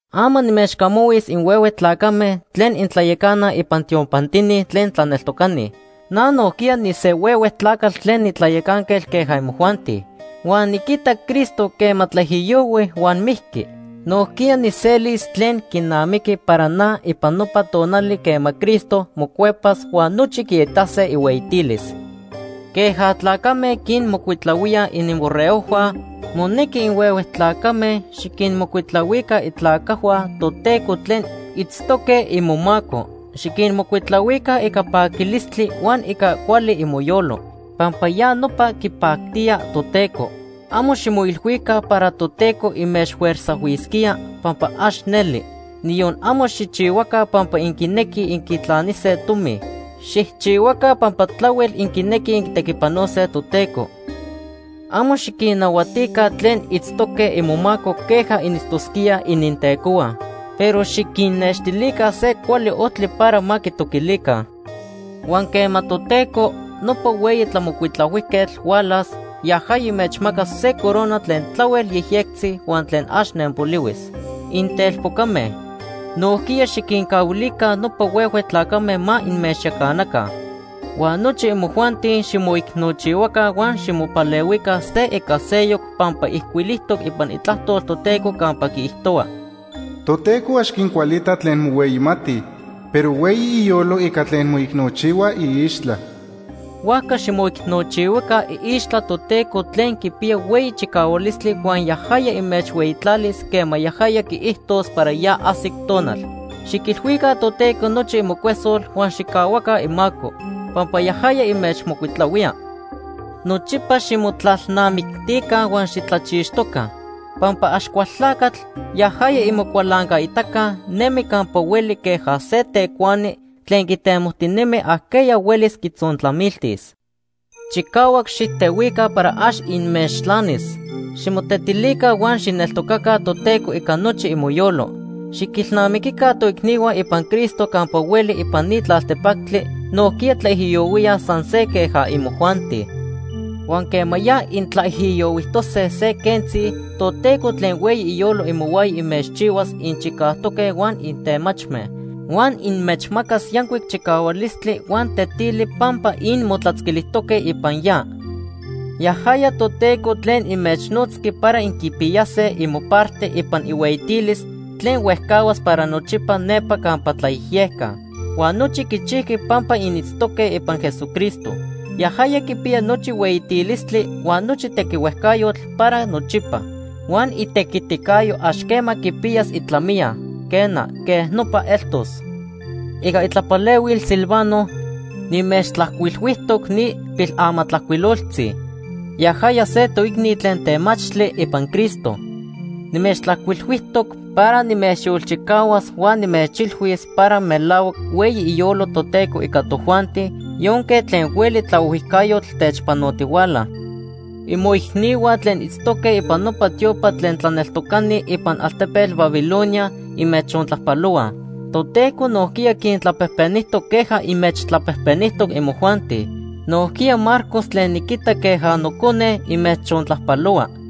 Ama nimechcamahuis inhuehue tlacame tlen intlayacanaj ipan tiopantini tlen tlaneltocani. Na nojquiya nise huehue tlacatl tlen nitlayacanquetl queja imojuanti. Huan niquitac Cristo quema tlaijiyohui huan mijqui. Nojquiya nijselis tlen quinamiqui para na ipan nopa tonali quema Cristo mocuepas huan nochi quiitase ihueyitilis. Queja tlacame quinmocuitlahuíaj ininborregojhua, monequi inhuehue tlacame xiquinmocuitlahuica itlacajhua Toteco tlen itztoque imomaco. Xiquinmocuitlahuica ica paquilistli huan ica cuali imoyolo, pampa ya nopa quipactía Toteco. Amo ximoilhuica para Toteco inmechfuerzajhuisquía, pampa ax neli. Niyon amo xijchihuaca pampa inquinequij inquitlanise tomi. Xijchihuaca pampa tlahuel inquinequij inquitequipanose Toteco. Amo xiquinnahuatica tlen itztoque imomaco queja initztosquíaj inintecohua. Pero xiquinnextilica se cuali ojtli para ma quitoquilica. Huan quema Toteco, nopa Hueyi Tlamocuitlahuijquetl hualas, yajaya inmechmacas se corona tlen tlahuel yejyectzi huan tlen ax nenpolihuis. Intelpocame, nojquiya xiquincahuilica nopa huehue tlacame ma inmechyacanaca. Huan nochi imojuanti ximoicnochihuaca huan ximopalehuica se ica seyoc pampa ijcuilijtoc ipan Itlajtol Toteco campa quiijtohua: “Toteco ax quincualita tlen mohueyimatij, pero hueyi iyolo ica tlen moicnochihuaj iixtla.” Huajca ximoicnochihuaca iixtla Toteco tlen quipiya hueyi chicahualistli huan yajaya inmechhueyitlalis quema yajaya quiijtos para ya ajsic tonal. Xiquilhuica Toteco nochi imocuesol huan xijcahuaca imaco, pampa yajaya inmechmocuitlahuía. Nochipa ximotlalnamictica huan xitlachixtoca, pampa Axcualtlacatl, yajaya imocualancaitaca, nemi campa hueli queja se tecuani tlen quitemojtinemi ajqueya huelis quitzontlamiltis. Chicahuac xijtehuica para ax inmechtlanis. Ximotetilica huan xijneltocaca Toteco ica nochi imoyolo. Xiquinilnamiquica toicnihua ipan Cristo campa hueli ipan ni tlaltepactli nojquiya tlaijiyohuíaj san se queja imojuanti. Huan quema ya intlaijiyohuijtose se quentzi, Toteco tlen hueyi iyolo imohuaya inmechchihuas inchicajtoque huan intemachme. Huan inmechmacas yancuic chicahualistli huan tetili pampa inmotlatzquilijtoque ipan ya. Yajaya Toteco tlen inmechnotzqui para inquipiyase imoparte ipan ihueyitilis tlen huejcahuas para nochipa nepa campa tlayejyeca. Huan nochi quichijqui pampa initztoque ipan Jesucristo. Yajaya quipiya nochi hueyitilistli huan nochi tequihuejcayotl para nochipa. Huan itequiticayo ax quema quipiyas itlamiya. Quena, quej nopa eltos. Ica itlapalehuil Silvano nimechtlajcuilhuijtoc ni pilamatlajcuiloltzi. Yajaya se toicni tlen temachtli ipan Cristo. Nimechtlajcuilhuijtoc para nimechyolchicahuas huan nimechilhuis para melahuac hueyi iyolo Toteco ica tojuanti yonque tlen hueli tlaohuijcayotl techpanotihuala. Imoicnihua tlen itztoque ipan nopa tiopa tlen tlaneltocani ipan altepetl Babilonia inmechontlajpalohuaj. Toteco nojquiya quintlapejpenijtoc queja inmechtlapejpenijtoc imojuanti. Nojquiya Marcos tlen niquita queja nocone, inmechontlajpalohua.